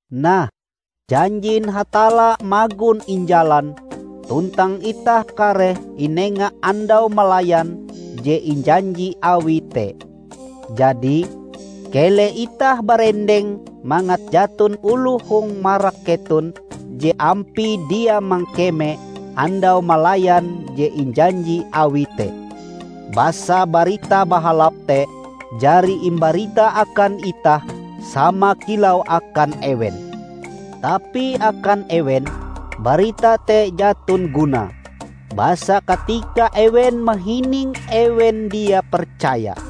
Nah, janjin Hatalla magon injalan, tuntang itah kareh inenga andau malayan je injanji Awie te. Jadi, keleh itah barendeng mangat jaton oloh hong marak keton je ampie dia mangkeme andau malayan je injanji Awie te. Basa Barita Bahalap te jari imbarita akan itah sama kilau akan ewen. Tapi akan ewen, barita te jaton gunae. Basa katika ewen mahininge ewen dia percaya.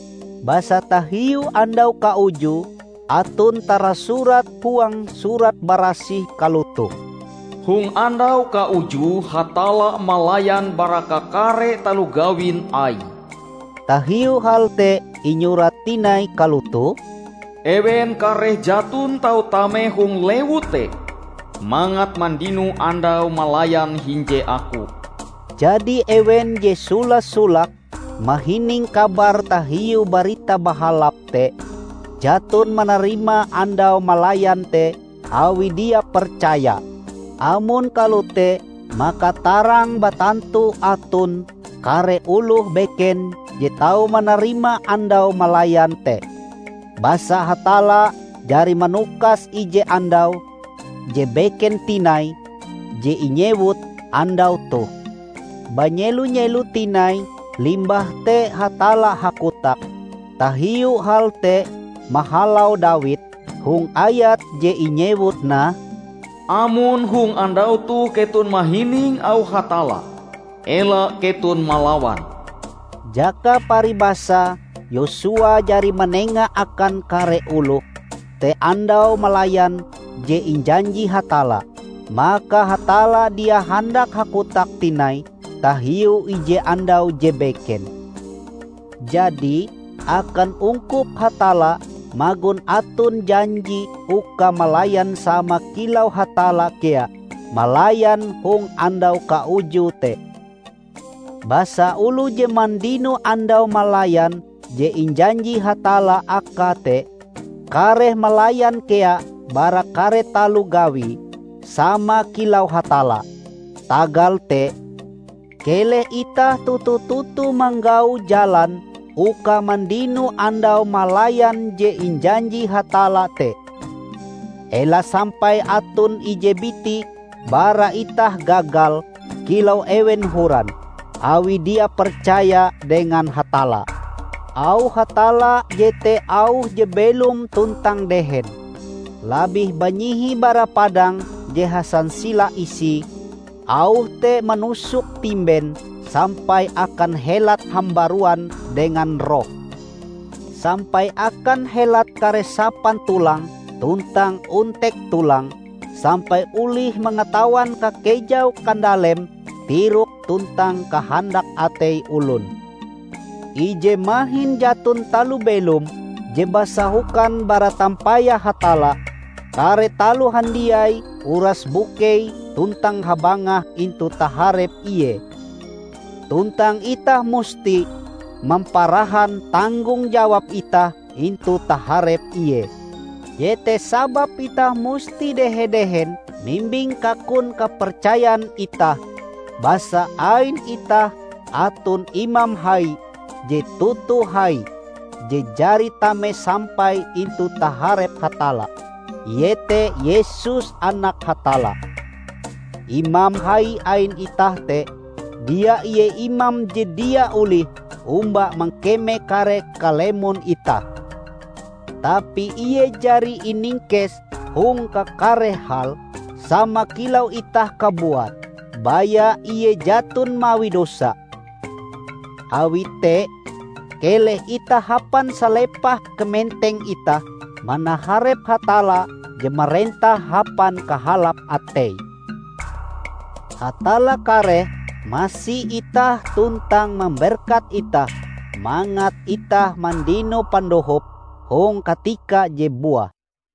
Basa tahiu andau kaujue, aton tarasurat huang Surat Barasih kalotoh. "Hong andau kauju Hatalla malayan bara kakare taloh gawin Aie." Tahiu hal te inyurat tinai kalotoh, "Ewen kareh jaton tau tame hong lewu te mangat mandino andau malayan hinje Aku." Jadi ewen je sola-solake mahining kabar tahiu Barita Bahalap te, jaton manarima andau malayan te awi dia percaya. Amon kalote maka tarang batantu aton kare oloh beken je tau manarima andau malayan te. Basa Hatalla jari manukas ije andau je beken tinai, je inyewut "Andau toh". Banyelo-nyelo tinai limbah te Hatalla hakotak tahiu hal te mahalau Dawid, hong ayat je inyewut nah, "Amon hong andau toh keton mahining auh Hatalla, ela keton malawan." Jaka paribasae Yosua jari manenga akan kare oloh te andau malayan je injanji Hatalla, maka Hatalla dia handak hakotak tinai tahiu ije andau je beken. Jadi, akan ungkup Hatalla magon aton janji uka malayan sama kilau Hatalla kea malayan hong andau kaujue te. Basa oloh je mandino andau malayan je injanji Hatalla akae te, kareh malayan kea bara kare taloh gawie, sama kilau Hatalla. Tagal te, keleh itah toto-toto manggau jalan uka mandino andau malayan je injanji Hatalla te. Ela sampai aton ije biti bara itah gagal kilau ewen horan, awie dia percaya dengan Hatalla. Auh Hatalla jete auh je belom tuntang dehen; labih banyihi bara padang je hasansila isie. Auh te manusuk timben sampai akan helat hambaruan dengan roh; sampai akan helat kare sapan tulang tuntang ontek tulang, sampai olih mangatawan kakejau kandalem tirok tuntang kahandak atei olon. Ije mahin jaton taloh belom je basahokan bara tampayah Hatalla, kare taloh handiai uras bukei tuntang habangah intu taharep Ie. Tuntang itah musti mamparahan tanggong jawab itah intu taharep Ie. Jete sababe itah musti dehe-dehen mimbing kakun kapercayan itah. Basa ain itah aton Imam Hai je toto hai, je jari tame sampai intu taharep Hatalla -- iete Yesus Anak Hatalla. Imam Hai ain itah te dia ie imam je dia olih omba mangkeme kare kalemon itah. Tapi Ie jari iningkes hong kakare hal, sama kilau itah kabuat; baya Ie jaton mawi dosa. Awi te, keleh itah hapan salepah kamenteng itah manaharep Hatalla je marentah hapan kahalap ateie. Hatalla kareh masi itah tuntang mamberkat itah mangat itah mandino pandohop hong katikae je buah.